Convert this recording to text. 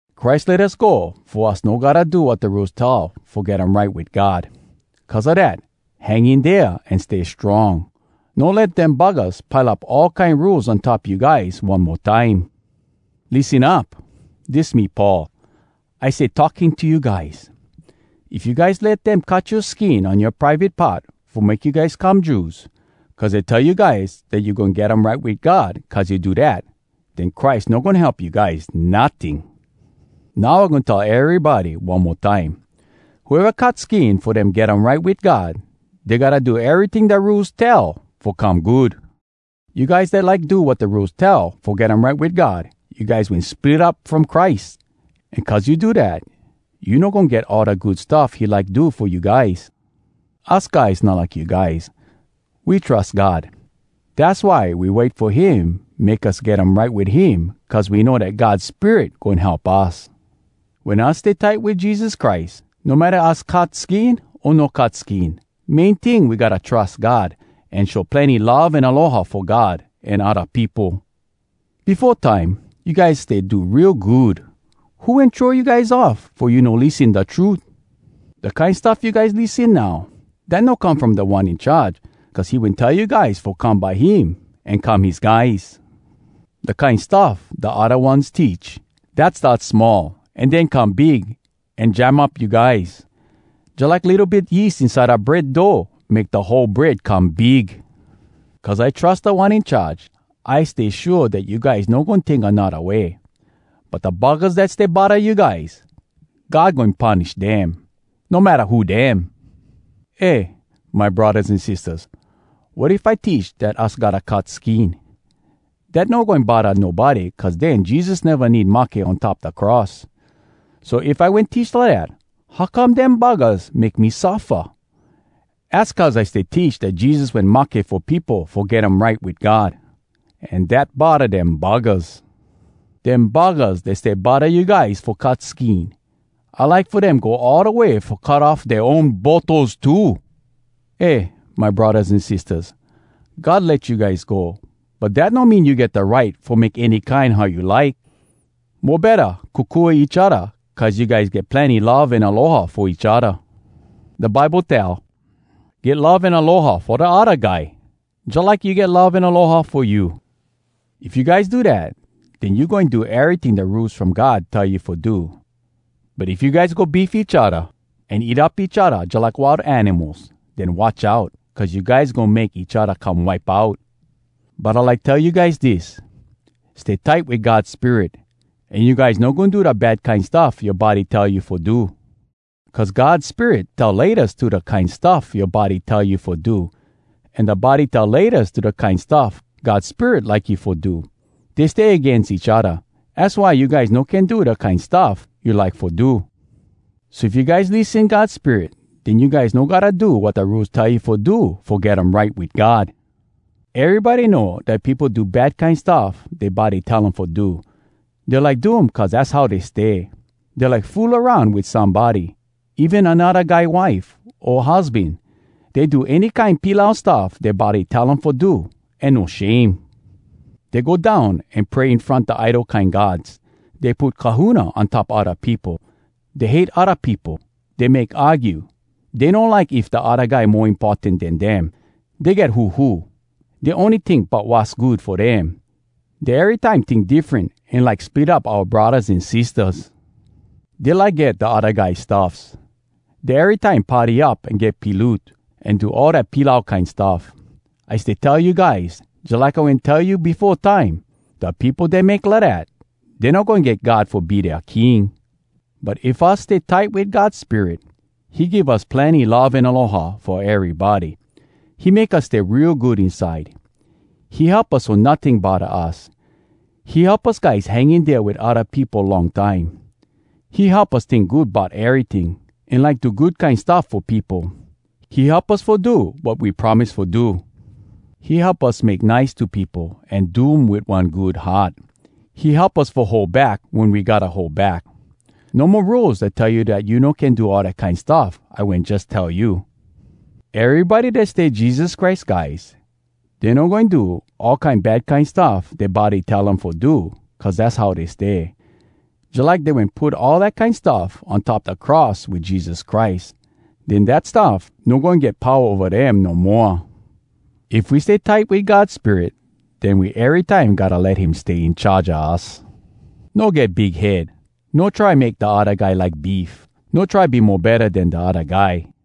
Christ let us go fo us no gotta do wat da Rules tell fo get um right wit God. Cuz a dat, hang in dea an stay strong. No let dem buggahs pile up all kine rules on top you guys one mo time. Lissen up! Dis me Paul. I stay talking to you guys. If you guys let dem cut yoa skin on yoa private part fo make you guys come Jews, cuz dey tell you guys dat you goin get um right wit God cuz you do dat, den Christ no goin help you guys, notting. Now I goin tell erybody one mo time: Whoeva cut skin fo dem get um right wit God, dey gotta do eryting da Rules tell fo come good. You guys dat like do wat da Rules tell fo get um right wit God, you guys wen split up from Christ. An cuz you do dat, you no goin get all da good stuff he like do fo you guys. Us guys not like you guys. We trus God. Dass why we wait fo him make us get um right wit him cuz we know dat God Spirit goin help us. Wen us stay tight wit Jesus Christ, no matta us cut skin o no cut skin, main ting, we gotta trus God, an show plenny love an aloha fo God an odda peopo. Befo time, you guys stay do real good. Who wen throw you guys off fo you no lissen da trut? Da kine stuff you guys lissen now, dat no come from Da One In Charge cuz he wen tell you guys fo come by him an come his guys. Da kine stuff da odda ones teach, dat start small an den come big an jam up you guys, jalike litto bit yeast inside da bread dough make da whole bread come big. Cuz I trus Da One In Charge, I stay shua dat you guys no goin tink anodda way. But da buggahs dat stay bodda you guys, God goin punish dem, no matta who dem. Eh, my braddahs an sistahs, wat if I teach dat us gotta cut skin? Dat no goin bodda nobody cuz den Jesus neva need mahke on top da cross. So if I wen teach lidat, how come dem buggahs make me suffa? Az cuz I stay teach dat Jesus wen mahke fo peopo fo get um right wit God. An dat bodda dem buggahs. Dem buggahs dat stay bodda you guys fo cut skin, I like fo dem go all da way fo cut off dea own botos too! Eh, my braddahs an sistahs, God let you guys go, but dat no mean you get da right fo make any kine how you like. Mo betta, kokua each odda cuz you guys get plenny love an aloha fo each odda. Da Bible tell, “Get love an aloha fo da odda guy, jalike you get love an aloha fo you.” If you guys do dat, den you goin do eryting da Rules From God tell you fo do. But if you guys go beef each odda, an eat up each odda jalike wild animals, den watch out, cuz you guys goin make each odda come wipe out. But I like tell you guys dis: Stay tight wit God Spirit, an you guys no goin do da bad kine stuff yoa body tell you fo do. Cuz God Spirit tell “Laytas” to da kine stuff yoa body tell you fo do, an da body tell “Laytas” to da kine stuff God Spirit like you fo do. Dey stay agains each odda. Az why you guys no can do da kine stuff you like fo do. So if you guys lissen God Spirit, den you guys no gotta do wat da Rules tell you fo do fo get um right wit God. Erybody know dat peopo do bad kine stuff dea body tell um fo do. Dey like do um cuz dass how dey stay. Dey like fool aroun wit somebody, even anodda guy wife o husban. Dey do any kine pilau stuff dea body tell um fo do an no shame. Dey go down an pray in front da idol kine gods. Dey put kahuna on top odda peopo. Dey hate odda peopo. Dey make argue. Dey no like if da odda guy mo importan den dem. Dey get huhu. Dey ony tink bout wass good fo dem. Dey erytime tink diffren an like split up oua braddahs an sistahs. Dey like get da odda guy stuffs. Dey erytime party up an get piloot, an do all dat pilau kine stuff. I stay tell you guys, jalike I wen tell you befo time, da peopo dat make lidat, dey no goin get God fo be dea King. But if us stay tight wit God Spirit, he give us plenny love an aloha fo erybody. He make us stay real good inside. He help us so notting bodda us. He help us guys hang in dea wit odda peopo long time. He help us tink good bout eryting, an like do good kine stuff fo peopo. He help us fo do wat we promise fo do. He help us make nice to peopo an do um wit one good heart. He help us fo hold back wen we gotta hold back. No mo rules dat tell you dat you no can do all dat kine stuff I wen jus tell you. Erybody dat stay Jesus Christ guys, dey no goin do all kine bad kine stuff dea body tell um fo do cuz dass how dey stay. Jalike dey wen put all dat kine stuff on top da cross wit Jesus Christ. Den dat stuff no goin get powa ova dem no moa. If we stay tight wit God Spirit, den we erytime gotta let him stay in charge a us. No get big head. No try make da odda guy like beef. No try be mo betta den da odda guy.